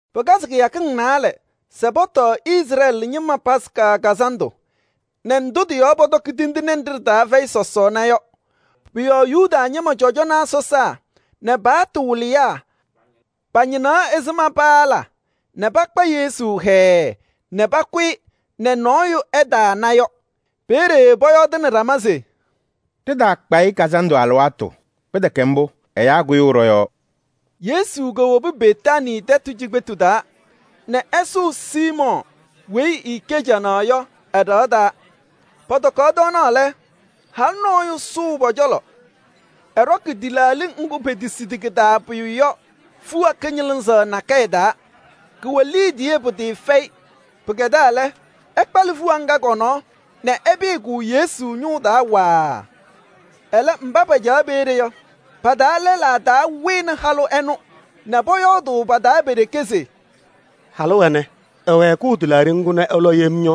Pɩkazɩ kɩyakɩŋ naalɛ se pɔtɔɔ Izrɛɛlɩ ñɩma Yomiye Taa Lɩʋ Kazandʋ ndʋ pɔtɔkɩ sɔsɔɔna fɛyɩ tindine yɔ. Pʋ-yɔɔ Yuda ñɩma cɔjɔnaa sɔsaa nɛ pa-paɣtʋ wɩlɩyaa pañɩnaɣ ɛzɩma mbʋ paala nɛ pakpa Yesu hɛɛɛ nɛ pakʋ-ɩ nɛ nɔɔyʋ ɛtaana yɔ. Peeye pɔyɔɔdɩnɩ ɖama se: “Ɖɩtaakpa-ɩ kazandʋ alɩwaatʋ, pɩtɛkɛ mbʋ, ɛyaa kʋyʋʋ ɖɔ-yɔɔ.” Yesu kowobi Betaanii tɛtʋ cikpetu taa nɛ ɛsʋʋ Siimɔɔ weyi ɛɛkɛ canaɣ yɔ ɛ-ɖɩɣa taa. Pɔtɔkaɣ tɔɔnaɣ lɛ, halʋ nɔɔyʋ sʋʋ pɔ-cɔlɔ, ɛɖɔkɩ tɩlaaɖɩ ŋgʋ petesidi kɩ-taa pʋyʋ yɔ fiɣa kɩñɩlɩzaɣ nakɛyɛ taa. Kʋwɛ liidiye pɩtɩɩfɛyɩ. Pɩkɛdaa lɛ, ɛkpalɩ fiɣa ŋga kɔ-nɔɔ nɛ ɛpɩyɩ-kʋ Yesu ñʋʋ taa waaa. Ɛlɛ mba pacaɣ peeye yɔ, pa-taa lɛlaa taa wɩnɩ halʋ ɛnʋ nɛ pɔyɔɔdʋʋ pa-taa pe-ɖeke se: “Halʋ ɛnɛ, ɛwɛɛkʋʋ tɩlaaɖɩ ŋgʋ nɛ ɛlɔ yem yɔ,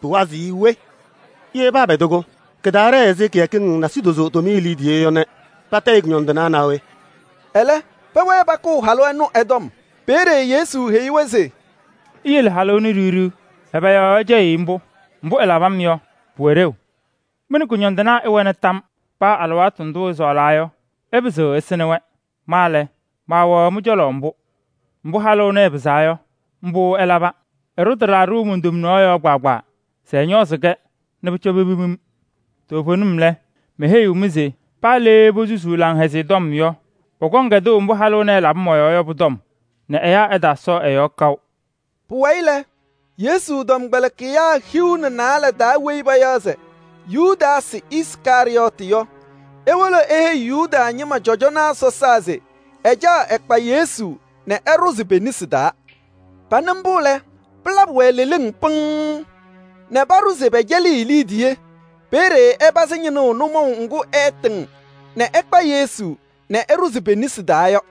pɩwazɩɣ-ɩ we? Ye paapɛdɩ-kʋ, kɩtaaɖɛɛ ɛzɩ kɩyakɩŋ nasidozo tʋmɩyɛ liidiye yɔ nɛ patayɩ kʋñɔndɩnaa naa we?” Ɛlɛ pɛwɛɛ pakʋʋ halʋ ɛnʋ ɛ-tɔm. Peeye Yesu heyi-wɛ se: “Iyele halʋ ɛnʋ ɖiɣ ɖiɣ. Ɛbɛ yɔɔ ɩcɛyɩɣ-ɩ mbʋ? Mbʋ ɛlabɩ-m yɔ, pʋwɛ ɖeu. Mɩ nɛ kʋñɔndɩnaa ɩwɛna tam. Paa alɩwaatʋ ndʋʋ ɩsɔɔlaa yɔ, ɩpɩzɩɣ ɩsɩnɩ-wɛ. Ma lɛ, maawɛɣ mɩ-cɔlɔ mbʋ. Mbʋ halʋ ɛnɛ ɛpɩzaa yɔ, mbʋ ɛlaba. Ɛɖʋ tɩlaaɖɩ mon-tomnaɣ yɔɔ kpaagbaa se ɛñɔɔzɩ-kɛ nɛ pʋcɔ pepim-m. Toovenim lɛ, meheyiɣ-mɩ se paa le posusuu Laŋhɛzɩyɛ Tɔm yɔ, pɔkɔŋ kɛdʋʋ mbʋ halʋ ɛnɛ ɛlabɩ mɔ-yɔɔ yɔ pʋ-tɔm nɛ ɛyaa ɛtaasɔɔ ɛ-yɔɔ kaʋ.” Pʋwayɩ lɛ, Yesu tɔmkpɛlɩkɩyaa hiu nɛ naalɛ taa weyi payaɣ se Yudaasɩ Iskarɩyɔɔtɩ yɔ, ewolo eheyi Yuda ñɩma cɔjɔnaa sɔsaa se ɛcaɣ ɛkpa Yesu nɛ ɛɖʋzɩ pe-nesi taa. Panɩ mbʋ lɛ, pɩlabɩ-wɛ leleŋ pɩŋŋ nɛ paɖʋ se pɛcɛlɩɣ-ɩ liidiye. Peeye ɛpazɩ ñɩnʋʋ nʋmɔʋ ŋgʋ ɛɛtɩŋ nɛ ɛkpa Yesu nɛ ɛɖʋzɩ pe-nesi taa yɔ.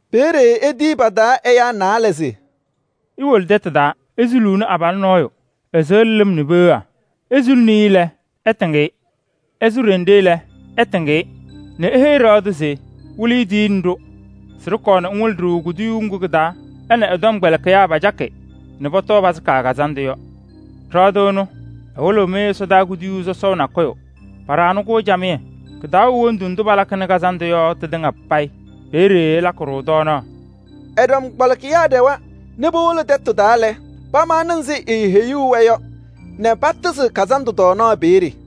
Peeye etiyi pa-taa ɛyaa naalɛ se: “Iwolo tɛtʋ taa, isuluuni abalʋ nɔɔyʋ, ɛsɩɣlɩ lɩm nɛ peɣa. Isuluni-i lɛ, ɩtɩŋ-ɩ. Ɛsʋ ɖenɖe lɛ, ɩtɩŋ-ɩ nɛ ɩpɔzɩ ɖɩɣa tʋ se: ‘Wɩlɩyʋ tiyini-ɖʋ se ɖɩkɔɔ ŋwɩlɩ-ɖʋ kuduyuu ŋgʋ kɩ-taa ɛ nɛ ɛ-tɔmkpɛlɩkɩyaa pacakɩ nɛ pɔtɔɔ Yomiye Taa Lɩʋ Kazandʋ yɔ.’ Ɖɩɣa tʋ ɛnʋ ɛwɩlɩɣ-mɩ ɛsɔdaa kuduyuu sɔsɔʋ nakʋyʋ, paɖaɣnɩ-kʋ camɩyɛ. Kɩ-taa wɛ wondu ndʋ palakɩnɩ kazandʋ yɔ tɩtɩŋa payɩ, peeye ɩlakɩ-ɖʋ tɔɔnaɣ.” Ɛ-tɔmkpɛlɩkɩyaa ɖɛwa nɛ powolo tɛtʋ taa lɛ, pamaɣna ɛzɩ eeheyuu-wɛ yɔ nɛ patɩzɩ kazandʋ tɔɔnaɣ peeye.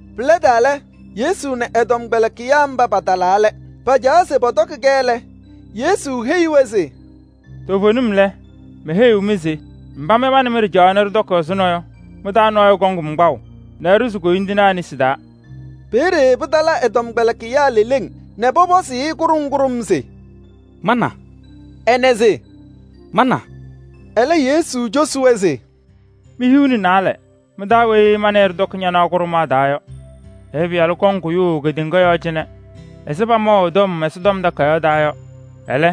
Pɩlɛdaa lɛ, Yesu nɛ ɛ-tɔmkpɛlɩkɩyaa mba patalaa lɛ. Pacaɣaɣ se pɔtɔkɩ lɛ, Yesu heyi-wɛ se: “Toovenim lɛ, meheyiɣ mɩ se mba mɩ ma nɛ mɩ ɖɩcaɣaɣ nɛ ɖɩtɔkɩ ɛzʋnɔ yɔ, mɩ-taa nɔɔyʋ kɔŋ-m kpaʋ nɛ ɛɖʋzɩ koyindinaa nesi taa.” Peeye pɩtala ɛ-tɔmkpɛlɩkɩyaa leleŋ nɛ pɔpɔzʋʋ-ɩ kʋɖʋm kʋɖʋm se: “Ma na?” Ɛnɛ se: “Ma na?” Ɛlɛ Yesu cosi-wɛ se: “Mi-hiu nɛ naalɛ mɩ-taa weyi ma nɛ ɩ ɖɩtɔkɩ ñanaɣ kʋɖʋmaɣ taa yɔ.” “Ɛyʋ Pɩyalʋ kɔŋ kʋyʋʋ kedeŋa yɔɔ cɩnɛ ɛzɩ pamaʋ ɛ-tɔm Ɛsɔtɔm Takayaɣ taa yɔ. Ɛlɛ,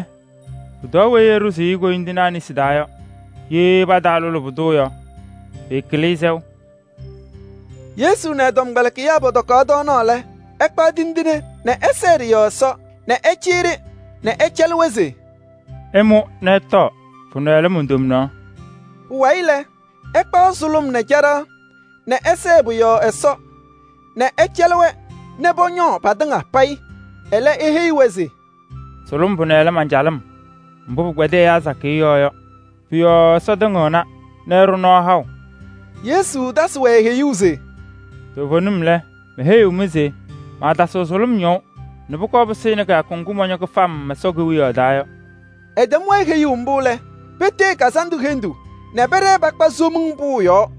pʋtɔɔ weyi ɛɖʋzʋʋ-ɩ koyindinaa nesi taa yɔ! Ye pataalʋlɩ pʋdʋ yɔ, pɩɩkɩlɩ-ɩ sɛʋ.” Yesu nɛ ɛ-tɔmkpɛlɩkɩyaa pɔtɔkaɣ tɔɔnaɣ lɛ, ɛkpaɣ tindine nɛ ɛsɛɛ ɖɩ-yɔɔ Ɛsɔ nɛ ɛcɩyɩ-ɖɩ nɛ ɛcɛlɩ-wɛ se: “Ɩmʋ nɛ ɩtɔɔ, pʋnɛ lɛ mon-tomnaɣ.” Pʋwayɩ lɛ, ɛkpaɣ sʋlʋm nɛ caɖaɣ nɛ ɛsɛɛ pʋ-yɔɔ Ɛsɔ nɛ ɛcɛlɩ-wɛ nɛ pɔñɔɔ patɩŋa payɩ. Ɛlɛ eheyi-wɛ se: “Sʋlʋm pʋnɛ lɛ man-calɩm mbʋ pɩkpɛdɩ ɛyaa sakɩyɛ yɔɔ yɔ. Pʋ-yɔɔ Ɛsɔ tɩŋɩɣna nɛ ɛɖʋ nɔɔ haʋ.” Yesu tasɩ-wɛ heyuu se: “Toovenim lɛ, meheyiɣ-mɩ se maatasɩɣ sʋlʋm ñɔʋ nɛ pʋkɔɔ pɩsɩnɩ kɩyakʋ ŋgʋ mɔñɔ kɩfam Ɛsɔ Kewiyaɣ taa yɔ.” Ɛtɛm-wɛ heyuu mbʋ lɛ, petee kazandʋ hendu nɛ pɛɖɛɛ pakpa Somiŋ Pʋʋ yɔɔ.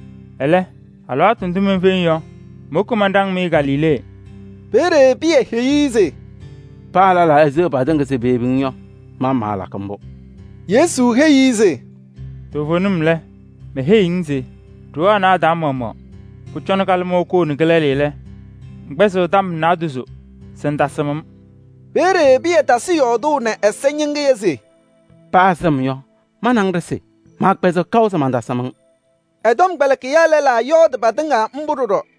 Ɛlɛ, alɩwaatʋ ndʋ menfeŋ yɔ, mowoki manɖaŋ-mɩ Galilee. Peeye Pɩyɛ heyi-i se: ‘Paa lɛlaa eseɣ patɩŋa se peyebi-ŋ yɔ, ma maalakɩ mbʋ.’” Yesu heyi-i se: “Toovenim lɛ, meheyiɣ-ŋ se ɖoo anɛ a-taa maɣmaɣ, pʋcɔ kalɩmɔʋ koo nɛ kɩlɛlɩ lɛ, ŋkpɛzɩɣ tɔm naadozo se ŋtasɩm-m.” Peeye Pɩyɛ tasɩ yɔɔdʋʋ nɛ ɛza ñɩŋɩyɛ se: “Paa sɩm yɔ, ma nɛ ŋ ɖɩsɩ, maakpɛzɩɣ kaʋ se mantasɩm-ŋ.” Ɛ-tɔmkpɛlɩkɩyaa lɛlaa yɔɔdɩ patɩŋa mbʋ ɖɔɖɔ.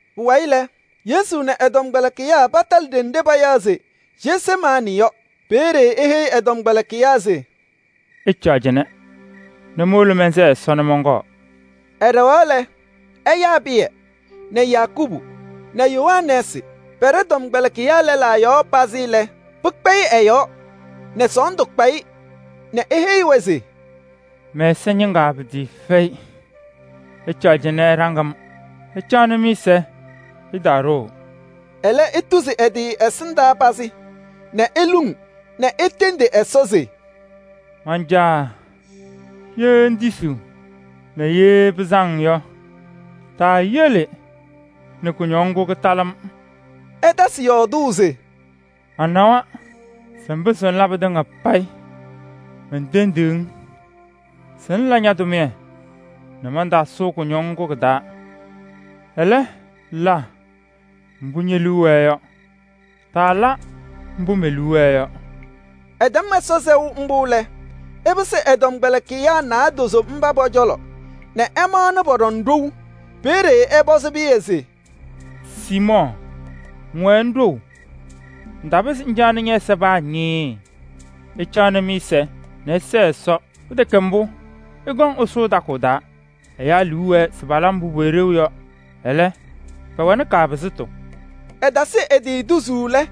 Pʋwayɩ lɛ, Yesu nɛ ɛ-tɔmkpɛlɩkɩyaa patalɩ ɖenɖe payaɣ se Jesemaanɩ yɔ. Peeye eheyi ɛ-tɔmkpɛlɩkɩyaa se: “Ɩcaɣ cɩnɛ nɛ mowolo mɛnsɛɛ Ɛsɔ nɛ mɔnkɔɔ.” Ɛɖɛɣaɣ lɛ, ɛyaa Pɩyɛ nɛ Yakubu nɛ Yohanɛɛsɩ. Pɛɖɛ tɔmkpɛlɩkɩyaa lɛlaa yɔɔ pazɩ lɛ, pɩkpɛyɩ ɛ-yɔɔ nɛ sɔɔndʋ kpa-ɩ nɛ eheyi-wɛ se: “Mɛ-ɛza ñɩŋaa pɩtɩɩfɛyɩ. Ɩcaɣ cɩnɛ ɩɖaŋ-m, ɩwɛɛ mɩ-ɛza yɔɔ.” Ɛlɛ etuzi ɛ-tɩ ɛsɩndaa pazɩ nɛ eluŋ nɛ etendi Ɛsɔ se: “Man-Caa! Ye ŋtisiɣ yɔ, taayele nɛ kʋñɔŋ ŋgʋ kɩtalɩ-m. Manawa se ŋpɩzɩɣ ŋla pɩtɩŋa payɩ. Mentendiɣ-ŋ se ŋla ña-tʋmɩyɛ nɛ mantaasʋʋ kʋñɔŋ ŋgʋ kɩ-taa. Ɛlɛ, la mbʋ ñe-liu wɛɛ yɔ, taala mbʋ me-liu wɛɛ yɔ.” Ɛtɛm Ɛsɔ sɛʋ mbʋ lɛ, ɛpɩsɩ ɛ-tɔmkpɛlɩkɩyaa naadozo mba pɔ-cɔlɔ nɛ ɛmaɣna pɔɖɔŋ ɖou. Peeye ɛpɔzɩ Pɩyɛ se: “Siimɔɔ, ŋwɛɛ ŋɖou! Ŋtapɩzɩ ŋcaɣnɩ ñɛ-ɛza paa ñɩɩɩ! Ɩcaɣnɩ mɩ-ɛza nɛ ɩsɛɛ Ɛsɔ, pɩtɛkɛ mbʋ, ɩkɔŋ ɩsʋʋ takʋʋ taa. Ɛyaa liu wɛɛ se pala mbʋ pʋwɛ ɖeu yɔ, ɛlɛ, pɛwɛnɩ kaapɩzɩtʋ.” Ɛtasɩ ɛ-tɩ tuzuu lɛ,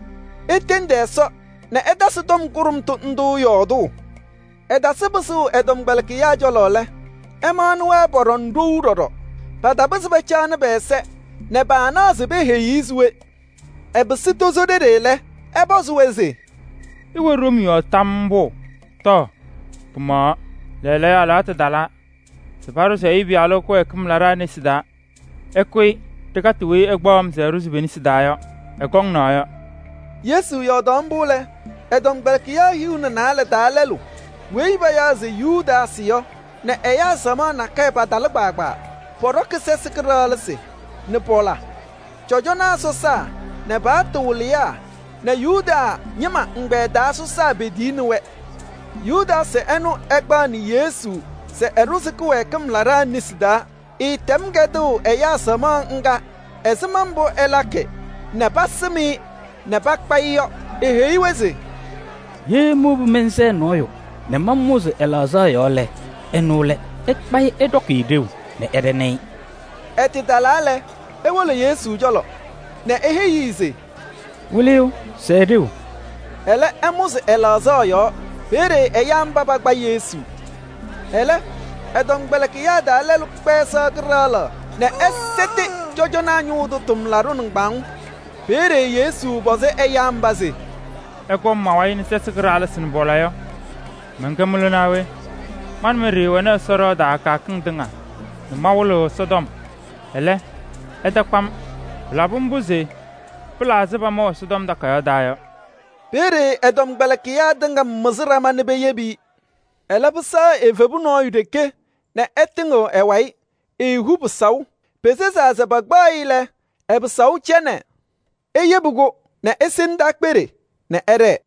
etendi Ɛsɔ nɛ ɛtasɩ tɔm kʋɖʋmtʋ ndʋ yɔɔdʋʋ. Ɛtasɩ pɩsʋʋ ɛ-tɔmkpɛlɩkɩyaa cɔlɔ lɛ, ɛmaɣnɩ-wɛ pɔɖɔŋ ɖou ɖɔɖɔ. Patapɩzɩ pacaɣnɩ pɛ-ɛza nɛ paanaɣ se peheyi-i se we. Ɛpɩsɩ tozo ɖeɖe lɛ, ɛpɔzɩ-wɛ se: “Ɩwɛ ɖom yɔɔ tam mbʋ? Tɔɔ, pɩmaɣaɣ! Lɛɛlɛɛyɔ alɩwaatʋ talaa se paɖʋzɩ Ɛyʋ Pɩyalʋ kɩwɛɛkɩm laɖaa nesi taa. Ɩkʋyɩ ɖɩkatɩ weyi ɛkpaɣ-m se ɛɖʋzɩ pe-nesi taa yɔ! Ɛkɔŋ naɣ yɔ!” Yesu yɔɔdaɣ mbʋ lɛ, ɛ-tɔmkpɛlɩkɩyaa hiu nɛ naalɛ taa lɛlʋ weyi payaɣ se Yudaasɩ yɔ nɛ ɛyaa samaɣ nakɛyɛ patɩtalɩ. Pɔɖɔkɩ sɛsɩ kɩɖaɣlɩsɩ nɛ pɔla. Cɔjɔnaa sɔsaa nɛ paɣtʋ wɩlɩyaa nɛ Yuda ñɩma ɛgbɛyɛ taa sɔsaa petiyini-wɛ. Yudaasɩ ɛnʋ ɛkpaɣnɩ Yesu se ɛɖʋzɩ kɩwɛɛkɩm laɖaa nesi taa. Ɛɛtɛm kɛdʋʋ ɛyaa samaɣ ŋga ɛzɩma mbʋ ɛlakɩ nɛ pasɩm-ɩ nɛ pakpa-ɩ yɔ. Eheyi-wɛ se: “Ye mowobi mɛnsɛɛ nɔɔyʋ nɛ mamʋzɩ ɛ-laɣzaɣ yɔɔ lɛ, ɛnʋ lɛ. Ɩkpa-ɩ ɩɖɔkɩ-ɩ ɖeu nɛ ɩɖɛnɩ-ɩ.” Ɛtɩtalaa lɛ, ewolo Yesu cɔlɔ nɛ eheyi-i se: “Wɩlɩyʋ, sɛɛ ɖeu!” Ɛlɛ ɛmʋzɩ ɛ-laɣzaɣ yɔɔ. Peeye ɛyaa mba pakpa Yesu. Ɛlɛ, ɛ-tɔmkpɛlɩkɩyaa taa lɛlʋ kpɛɛ sɩɣa kɩɖaɣlaɣ nɛ ɛsɛtɩ cɔjɔnaa ñʋʋ tʋ tʋmlaɖʋ nɩŋgbaŋʋʋ. Peeye Yesu pɔzɩ ɛyaa mba se: “Ɩkɔm ma-wayɩ nɛ sɛsɩ kɩɖaɣlɩsɩ nɛ pɔla yɔ, mɛnkɛ mɩlʋ naa we? Ma nɛ mɩ ɖɩɩwɛ Ɛsɔ ɖɩɣa taa kɩyakɩŋ tɩŋa nɛ mawɩlɩɣ Ɛsɔtɔm, ɛlɛ, ɩtakpa-m. Pɩlabɩ mbʋ se pɩla ɛzɩ pamaʋ Ɛsɔtɔm Takayaɣ taa yɔ.” Peeye ɛ-tɔmkpɛlɩkɩyaa tɩŋa mɩzɩ ɖama nɛ peyebi-i. Ɛlɛ, pɩsɛɣ evebu nɔɔyʋ ɖeke nɛ ɛtɩŋɩɣ ɛ-wayɩ, eehu pɩsaʋ. Pesezaa se pakpaɣ-ɩ lɛ, ɛ-pɩsaʋ cɛ nɛ eyebi-kʋ nɛ ese ndaakpeɖe nɛ ɛɖɛɛ.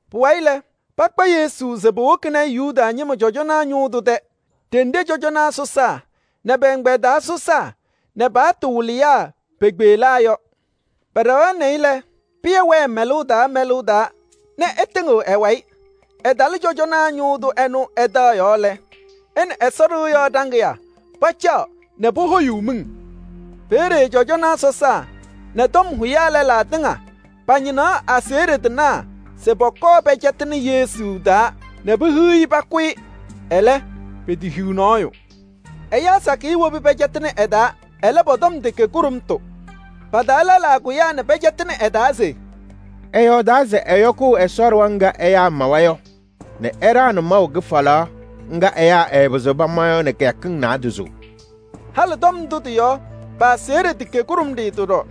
Pʋwayɩ lɛ, pakpa Yesu se powokini-i Yuda ñɩma cɔjɔnaa ñʋʋ tʋ tɛ ɖenɖe cɔjɔnaa sɔsaa nɛ pɛ-ɛgbɛyɛ taa sɔsaa nɛ pa-paɣtʋ wɩlɩyaa pekpeɣlaa yɔ. Pɛɖɛɣaɣnɩ-ɩ lɛ, Pɩyɛ wɛɛ mɛlʋʋ taa mɛlʋʋ taa nɛ ɛtɩŋɩɣ ɛ-wayɩ. Ɛtalɩ cɔjɔnaa ñʋʋ tʋ ɛnʋ ɛ-taɣ yɔɔ lɛ, ɛ nɛ Ɛsɔ ɖɩɣa yɔɔ ɖaŋɩyaa pacaɣ nɛ pohoyuu miŋ. Peeye cɔjɔnaa sɔsaa nɛ tɔm hʋyaa lɛlaa tɩŋa pañɩnaɣ aseɣɖe tɩnaa se pɔkɔɔ pɛcɛtɩnɩ Yesu taa nɛ pehiɣ-i pakʋ-ɩ. Ɛlɛ, petehiɣ nɔɔyʋ. Ɛyaa sakɩyɛ wobi pɛcɛtɩnɩ ɛ-taa. Ɛlɛ, pɔ-tɔm tɛkɛ kʋɖʋmtʋ. Pa-taa lɛlaa kʋyaa nɛ pɛcɛtɩnɩ ɛ-taa se: “Ɛyɔɔdaa se ɛyɔkʋʋ Ɛsɔ ɖɩɣa ŋga ɛyaa mawa yɔ nɛ ɛɖaɣnɩ maʋ kɩfalaɣ ŋga ɛyaa ɩɩpɩzɩɣ pama yɔ nɛ kɩyakɩŋ naadozo.” Halɩ tɔm ndʋ tɩ-yɔɔ, pa-aseɣɖe tɛkɛ kʋɖʋmɖɩyɛ ɖɔɖɔ.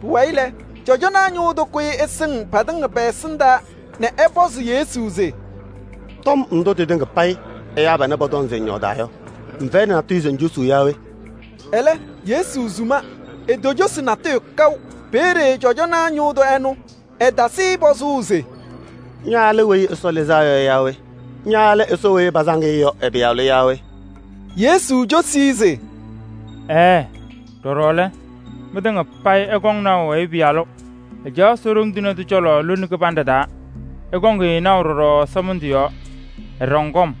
Pʋwayɩ lɛ, cɔjɔnaa ñʋʋ tʋ kʋyɩ ɛsɩŋ patɩŋa pɛ-ɛsɩndaa nɛ ɛpɔzɩ Yesu se: “Tɔm ndʋ tɩtɩŋa payɩ ɛyaa panɛ pɔtɔŋ se ŋyɔɔdaa yɔ, ŋfɛyɩnɩ natʋyʋ se ŋcosuu yaa we?” Ɛlɛ, Yesu suma, etocosi natʋyʋ kaʋ. Peeye cɔjɔnaa ñʋʋ tʋ ɛnʋ, ɛtasɩ-ɩ pɔzʋʋ se: “Ña lɛ Weyi Ɛsɔ Lɩzaa Yɔ yaa we? Ña lɛ Ɛsɔ weyi pasaŋ-ɩ yɔ ɛ-Pɩyalʋ?” Yesu cosi-i se: “Ɛɛɛ! Ɖɔɖɔ lɛ, mɩtɩŋa payɩ ɩkɔŋ naʋ Ɛyʋ Pɩyalʋ, ɛcaɣ Ɛsɔ Ɖoŋ Tɩŋa Tʋ cɔlɔ lone kɩbanɖɛ taa. Ɩkɔŋ-ɩ naʋ ɖɔɖɔ ɛsɔmɩndʋ yɔɔ, ɛɖɔŋ kɔm.”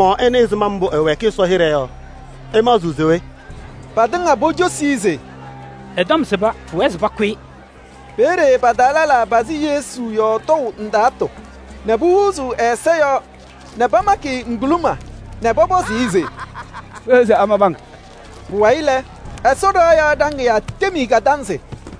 Mɩ-maɣmaɣ ɩnɩ ɛzɩma mbʋ ɛwɛɛkɩ Ɛsɔ hɩɖɛ yɔ. Ɩmaɣzɩɣ se we?” Patɩŋa pocosi-i se: “Ɛ-tɔm sɩba, pʋwɛɛ se pakʋ-ɩ!” Peeye pa-taa lɛlaa pazɩ Yesu yɔɔ tɔʋ ndaatʋ nɛ pohuuzuu ɛ-ɛza yɔɔ nɛ pamakɩ-ɩ ŋguluma nɛ pɔpɔzʋʋ-ɩ se: “Kpeɣ se amabɩ-ŋ.” Pʋwayɩ lɛ, Ɛsɔ ɖɩɣa yɔɔ ɖaŋɩyaa tem-i kadanzɩ.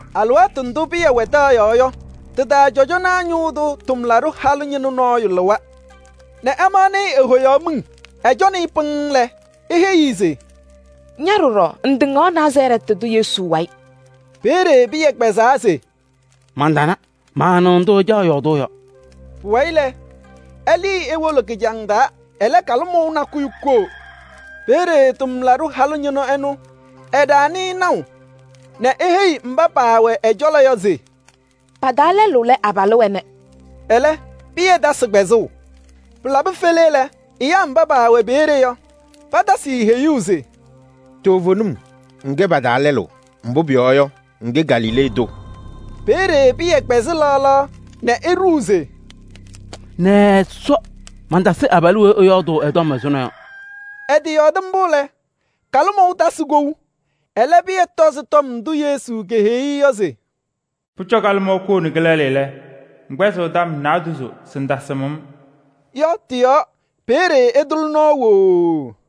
Alɩwaatʋ ndʋ Pɩyɛ wɛ taɣ yɔɔ yɔ, tɩ-taa cɔjɔnaa ñʋʋ tʋ tʋmlaɖʋ halʋ ñɩnʋ nɔɔyʋ lɩwa nɛ ɛmaɣnɩ-ɩ, ehoyaɣ miŋ. Ɛcɔnɩ-ɩ pɩŋŋ lɛ, eheyi-i se: “Ña ɖɔɖɔ, ŋtɩŋaɣ Nazarɛɛtɩ tʋ Yesu wayɩ.” Peeye Pɩyɛ kpɛzaa se: “Mantana, maanɩɣ ndʋ ŋcaɣ yɔɔdʋʋ yɔ.” Pʋwayɩ lɛ, ɛlɩɩ ewolo kɩjaŋ taa. Ɛlɛ kalɩmɔʋ nakʋyʋ koo. Peeye tʋmlaɖʋ halʋ ñɩnʋ ɛnʋ, ɛɖaɣnɩ-ɩ naʋ nɛ eheyi mba paawɛ ɛ-cɔlɔ yɔ se: “Pa-taa lɛlʋ lɛ abalʋ ɛnɛ.” Ɛlɛ, Pɩyɛ tasɩ kpɛzʋʋ. Pɩlabɩ fele lɛ, ɛyaa mba paawɛ peeye yɔ, patasɩ-ɩ heyuu se: “Toovenim! Ŋkɛ pa-taa lɛlʋ, mbʋ pʋyɔɔ yɔ, ŋkɛ Galilee tʋ.” Peeye Pɩyɛ kpɛzɩ laɣ laɣ nɛ eɖuu se: “Nɛ Ɛsɔ! Mantasɩ abalʋ weyi ɩyɔɔdʋʋ ɛ-tɔm ɛzʋnɔ yɔ!” Ɛtɩyɔɔdɩ mbʋ lɛ, kalɩmɔʋ tasɩ kou. Ɛlɛ, Pɩyɛ tɔzɩ tɔm ndʋ Yesu keheyi-i se: “Pʋcɔ kalɩmɔʋ koo nɛ kɩlɛlɩ lɛ, ŋkpɛzɩɣ tɔm naadozo se ŋtasɩm-m” yɔ tɩ-yɔɔ, peeye ɛtʋlɩ nɔɔ wooo.